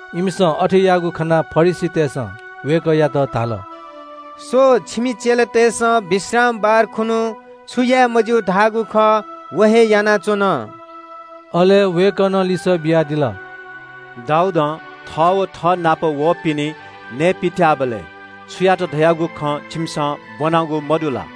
इमिसं अथे याःगु खनाः फरिसीतय्‌सं वय्‌कःयात धाल – “स्‍व, छिमि चेलातय्‌सं विश्रामबार खुन्‍हु छु याये मज्‍यू धाःगु खः व हे यानाच्‍वन।” अले वय्‌कलं लिसः बियादिल – “दाऊदं थः व थःनाप वःपिनि नये पित्‍याःबलय् छु यात धयागु खँ छिमिसं ब्‍वनागु मदु ला?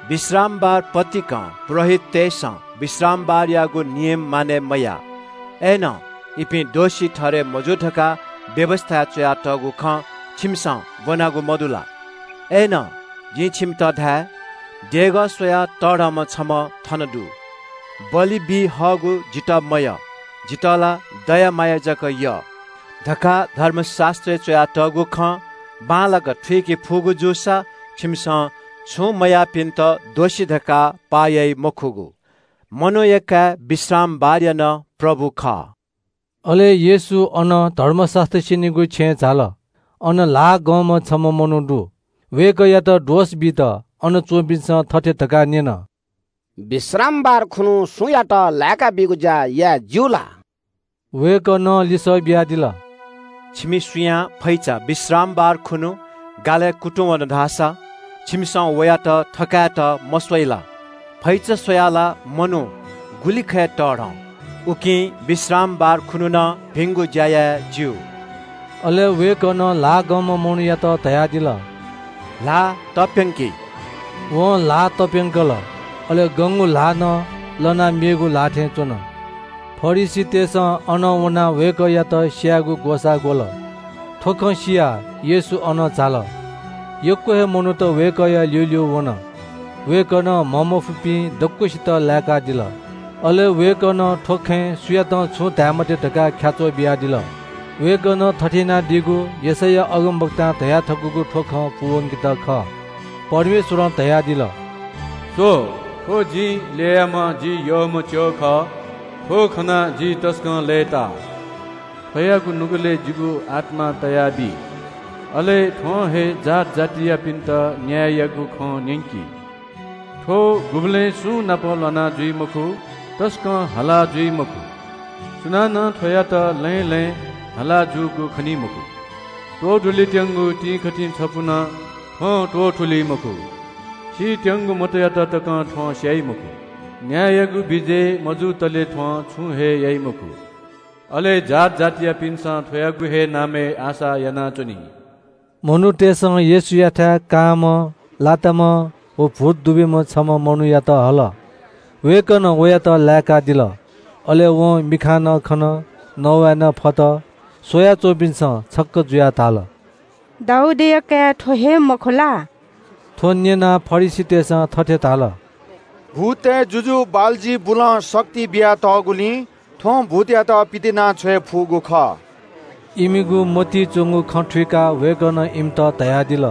विश्रामबार पतिकं पुजाहारीतय्‌सं विश्रामबारयागु नियम मानय् मयाः। अय्‌नं इपिं दोषी ठहरय् मजू धकाः व्‍यवस्‍थाय् च्‍वयातःगु खँ छिमिसं ब्‍वनागु मदु ला? अय्‌नं जिं छिमित धाये – देगः स्‍वयाः तःधंम्‍ह छम्‍ह थन दु। ‘बलि बी हःगु जितः मयः, जितः ला दया माया जक यः’ धकाः धर्मशास्‍त्रय् च्‍वयातःगु खँ बांलाक थुइके फुगु जूसा छिमिसं छुं मयाःपिन्‍त दोषी धकाः पाः याइ मखुगु। मनूया काय् विश्रामबारया नं प्रभु खः।” अले येशू अनं धर्मशास्‍त्र स्‍यनीगु छेँय् झाल। अन ल्‍हाः गंम्‍ह छम्‍ह मनू दु। वय्‌कःयात दोष बीत अन च्‍वंपिन्‍सं थथे धकाः न्‍यन – “विश्रामबार खुन्‍हु सुयातं लाय्‌काबीगु ज्‍या याये ज्‍यू ला?” वय्‌कलं लिसः बियादिल – “छिमि सुयां फैचा विश्रामबार खुन्‍हु गालय् कुतुंवन धाःसा छिमिसं वयात थकायेत मस्‍वइ ला? फैचा स्‍वयाः ला मनू गुलि यक्‍व मू वं। उकिं विश्रामबार खुन्‍हु नं भिंगु ज्‍या याये ज्‍यू।” अले वय्‌कलं ल्‍हाः गंम्‍ह मनूयात धयादिल – “ल्‍हाः तप्‍यंकि।” वं ल्‍हाः तप्‍यंकल। अले गंगु ल्‍हाः लनाः मेगु ल्‍हाः थें च्‍वन। फरिसीतय्‌सं अनं वनाः वय्‌कःयात स्‍यायेगु ग्‍वसाः ग्‍वल। थ्‍व खँ सियाः येशू अनं झाल। यक्‍व हे मनूत वय्‌कःया ल्‍यूल्‍यू वन। वय्‌कलं म्‍हंमफुपिं दक्‍वसित लाय्‌कादिल। अले वय्‌कलं थ्‍व खँय् सुयातं छुं धाये मते धकाः ख्‍याच्‍वः बियादिल। वय्‌कलं थथे यानादीगु यशैया अगमवक्तां धयाथकूगु थ्‍व खँ पूवंकेत खः – परमेश्‍वरं धयादिल – “स्‍व, थ्‍व जिं ल्‍ययाम्‍ह जि यःम्‍ह च्‍यः खः। थ्‍व खनाः जि तसकं लय्‌ताः। थ्‍वयागु नुगलय् जिगु आत्‍मा तयाबी, अले थ्‍वं हे जात जातियापिन्‍त न्‍याययागु खँ न्‍यंकी। थ्‍व गुबलें सुंनाप ल्‍वाना जुइ मखु, तसकं हाला जुइ मखु। सुनानं थ्‍वयात लँय् लँय् हाला जूगु खनी मखु। त्‍वधुलेत्‍यंगु तिंकथि छपु नं थ्‍वं त्‍वथुली मखु। सीत्‍यंगु मतयात तकं थ्‍वं स्‍याइ मखु। न्‍याययागु विजय मजुतले थ्‍वं छुं हे याइ मखु। अले जात जातियापिन्‍सं थ्‍वयागु हे नामय् आशा यानाच्‍वनी।” मनूतय्‌सं येशूयाथाय् छम्‍ह कांम्‍ह लाताम्‍ह व भूत दुब्‍यूम्‍ह मनूयात हल। वय्‌कलं वयात लाय्‌कादिल। अले वं मिखां खन, नवाये नं फत। स्‍वयाच्‍वंपिन्‍सं छक्‍क जुयाः धाल – “दाऊदया काय् थ्‍व हे मखु ला?” थ्‍व न्‍यनाः फरिसीतय्‌सं थथे धाल – “भूततय् जुजु बालजिबुलं शक्ति बियातःगुलिं थ्‍वं भूतयात पितिनाछ्वये फुगु खः।” इमिगु मतिइ च्‍वंगु खँ थुइकाः वय्‌कलं इमित धयादिल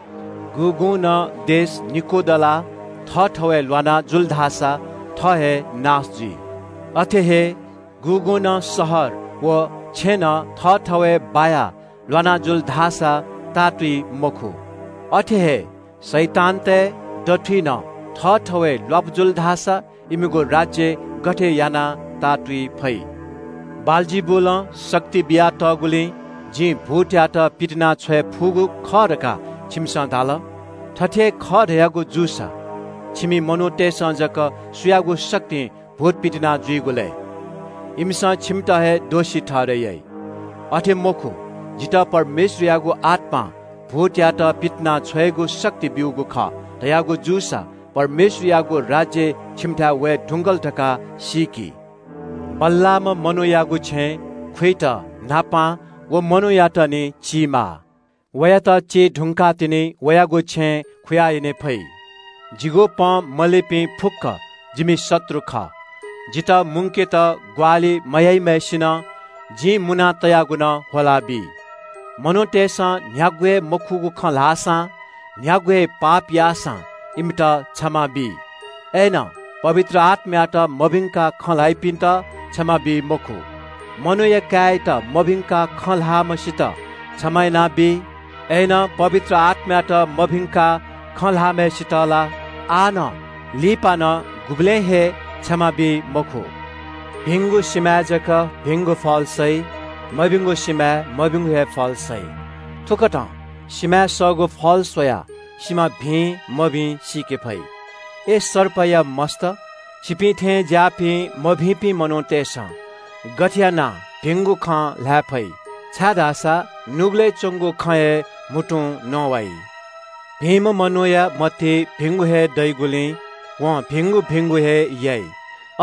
– “गुगुं नं राज्‍य निकू दलाः थःथवय् ल्‍वाना जुल धाःसा थः हे नाश जुइ। अथे हे गुगुं नं शहर व छेँनं थःथवय् बायाः ल्‍वाना जुल धाःसा ताःतुइ मखु। अथे हे शैतानतय् दथुइ नं थःथवय् ल्‍वापु जुल धाःसा इमिगु राज्‍य गथे यानाः ताःतुइ फइ? बालजिबुलं शक्ति बियातःगुलिं जिं भूतयात पितिनाछ्वये फुगु खः धकाः छिमिसं धाल। थथे हे खः धयागु जूसा छिमि मनूतय्‌सं जक सुयागु शक्तिं भूत पितिनाछ्वइगु लय्? इमिसं छिमित हे दोषी ठहरय् याइ। अथे मखु, जितः परमेश्‍वरयागु आत्‍मां भूतयात पितिनाछ्वयेगु शक्ति ब्‍यूगु खः धयागु जूसा परमेश्‍वरयागु राज्‍य छिमिथाय् वये धुंकल धकाः सीकि। बल्‍लाःम्‍ह मनूयागु छेँय् खुइत न्‍हापां व मनूयात निं चीमाः। वयात चीधुंकाः तिनि वयागु छेँय् खुयाः यने फइ।” “जिगु पँ मलीपिं फुक्‍क जिमि शत्रु खः। जितः मुंकेत ग्‍वाहालि मयाइम्‍हय्‌सिनं जिं मुना तयागु नं ह्वलाबी। “मनूतय्‌सं न्‍ह्यागु हे मखुगु खँ ल्‍हाःसां न्‍ह्यागु हे पाप याःसां इमित क्षमा बी, पवित्र आत्‍मायात मभिंकाः खँ ल्‍हाइपिन्‍त धाःसा क्षमा बी मखु। मनूया काय्‌यात मभिंकाः खँ ल्‍हाःम्‍हय्‌सित क्षमा यानाबी, पवित्र आत्‍मायात मभिंकाः खँ ल्‍हाःम्‍हय्‌सित धाःसा आः नं, लिपा नं, गुबलें हे क्षमा बी मखु।” “भिंगु सिमाय् जक भिंगु फल सइ। मभिंगु सिमाय् मभिंगु हे फल सइ। थुकथं सिमाय् सःगु फल स्‍वयाः सिमा भिं मभिं सीके फइ। अय् सर्पया मस्‍त, छिपिं थें ज्‍याःपिं मभिंपिं मनूतय्‌सं गथे यानाः भिंगु खँ ल्‍हाये फइ? छाय्‌धाःसा नुगलय् च्‍वंगु खँ हे म्‍हुतुं नवाइ। भिंम्‍ह मनूया मतिइ भिंगु हे दइगुलिं वं भिंगु भिंगु हे याइ।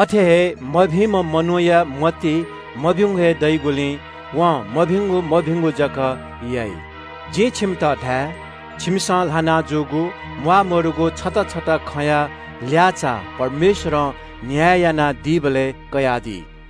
अथे हे मभिंम्‍ह मनूया मतिइ मभिंगु हे दइगुलिं वं मभिंगु मभिंगु जक याइ।” “जिं छिमित धाये – छिमिसं ल्‍हाना जूगु म्‍वाःमदुगु छता छता खँया ल्‍याःचाः परमेश्‍वरं न्‍याय यानादीबलय् कयादी।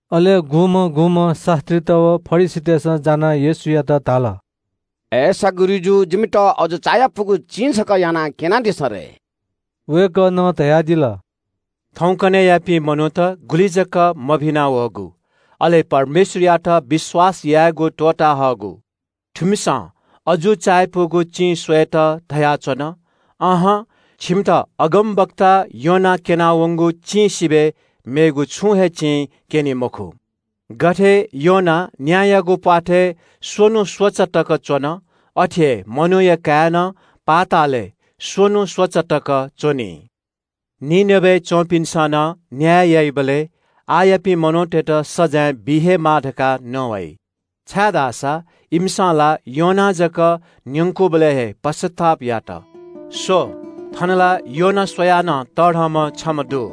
अले गुम्‍हं गुम्‍हं शास्‍त्रीत व फरिसीतय्‌सं जानाः येशूयात धाल – “अय्‌सा गुरुजु, जिमित अजू चायापुगु चिं छकः यानाः क्‍यनादिसँ रे।” वय्‌कलं धयादिल – “थौंकन्‍हय्‌यापिं मनूत गुलि जक मभिना वःगु, अले परमेश्‍वरयात विश्‍वास यायेगु त्‍वःता हःगु। थुमिसं अजू चायापुगु चिं स्‍वयेत धयाच्‍वन। अहं, छिमित अगमवक्ता योनां क्‍यना वंगु चिं सिबय् मेगु छुं हे चिं क्‍यनी मखु। गथे योना न्‍यायागु प्‍वाथय् स्‍वन्‍हु स्‍वचा तक च्‍वन, अथे हे मनूया काय् नं पृथ्‍वीया दुने स्‍वन्‍हु स्‍वचा तक च्‍वनी। “निनवेय् च्‍वंपिन्‍सं नं न्‍याय याइबलय् आःयापिं मनूतय्‌त सजाँय बी हे माः धकाः नवाइ, छाय्‌धाःसा इमिसं ला योनां जक न्‍यंकूबलय् हे पश्‍चाताप यात। स्‍व, थन ला योना स्‍वयाः नं तःधंम्‍ह छम्‍ह दु।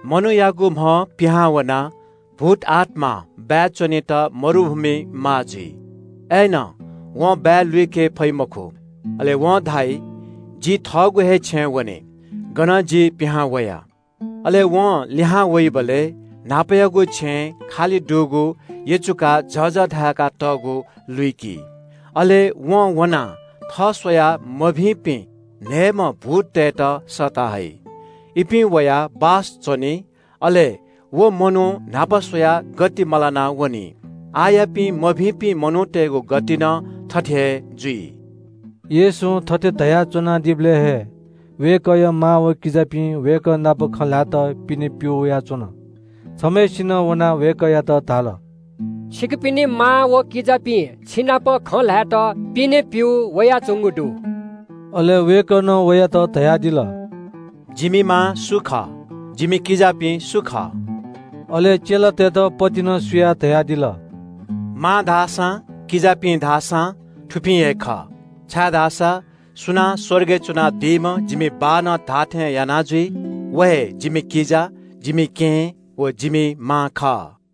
“मनूयागु म्‍हं पिहां वनाः भूतआत्‍मां बाय् च्‍वनेत मरुभूमिइ माः जुइ। अय्‌नं वं बाय् लुइके फइ मखु। अले वं धाइ ‘जि न्‍हापा च्‍वनाच्‍वनागु छेँ हे लिहां वने।’ अले वं लिहां वइबलय् न्‍हापायागु छेँ यचुकाः झःझः धाय्‌कातःगु व खालिगु लुइकी। अले वं वनाः थः स्‍वयाः मभिंपिं न्‍हय्‌म्‍ह भूततय्‌त सःता हइ। इपिं वयाः अन बाय् च्‍वनी। अले व मनू न्‍हापा स्‍वयाः गति मलाना वनी। आःयापिं मभिंपिं मनूतय्‌गु गति नं थथे हे जुइ।” येशूं थथे धयाच्‍वनादीबलय् हे वय्‌कःया मां व किजापिं वय्‌कः नाप खँ ल्‍हायेत पिने प्‍यू वयाच्‍वन। छम्‍हय्‌सिनं वनाः वय्‌कःयात धाल – “छिकपिनि मां व किजापिं छिनाप खँ ल्‍हायेत पिने प्‍यू वयाच्‍वंगु दु।” अले वय्‌कलं वयात धयादिल – “जिमि मां सु खः? जिमि किजापिं सु खः?” अले चेलातय्‌त पतिचां क्‍यनाः धयादिल – “मां धाःसां किजापिं धाःसां थुपिं हे खः। छाय्‌धाःसा सुनां स्‍वर्गय् च्‍वनादीम्‍ह जिमि बाःनं धाःथें याना जुइ व हे जिमि किजा, जिमि केहेँ व जिमि मां खः।”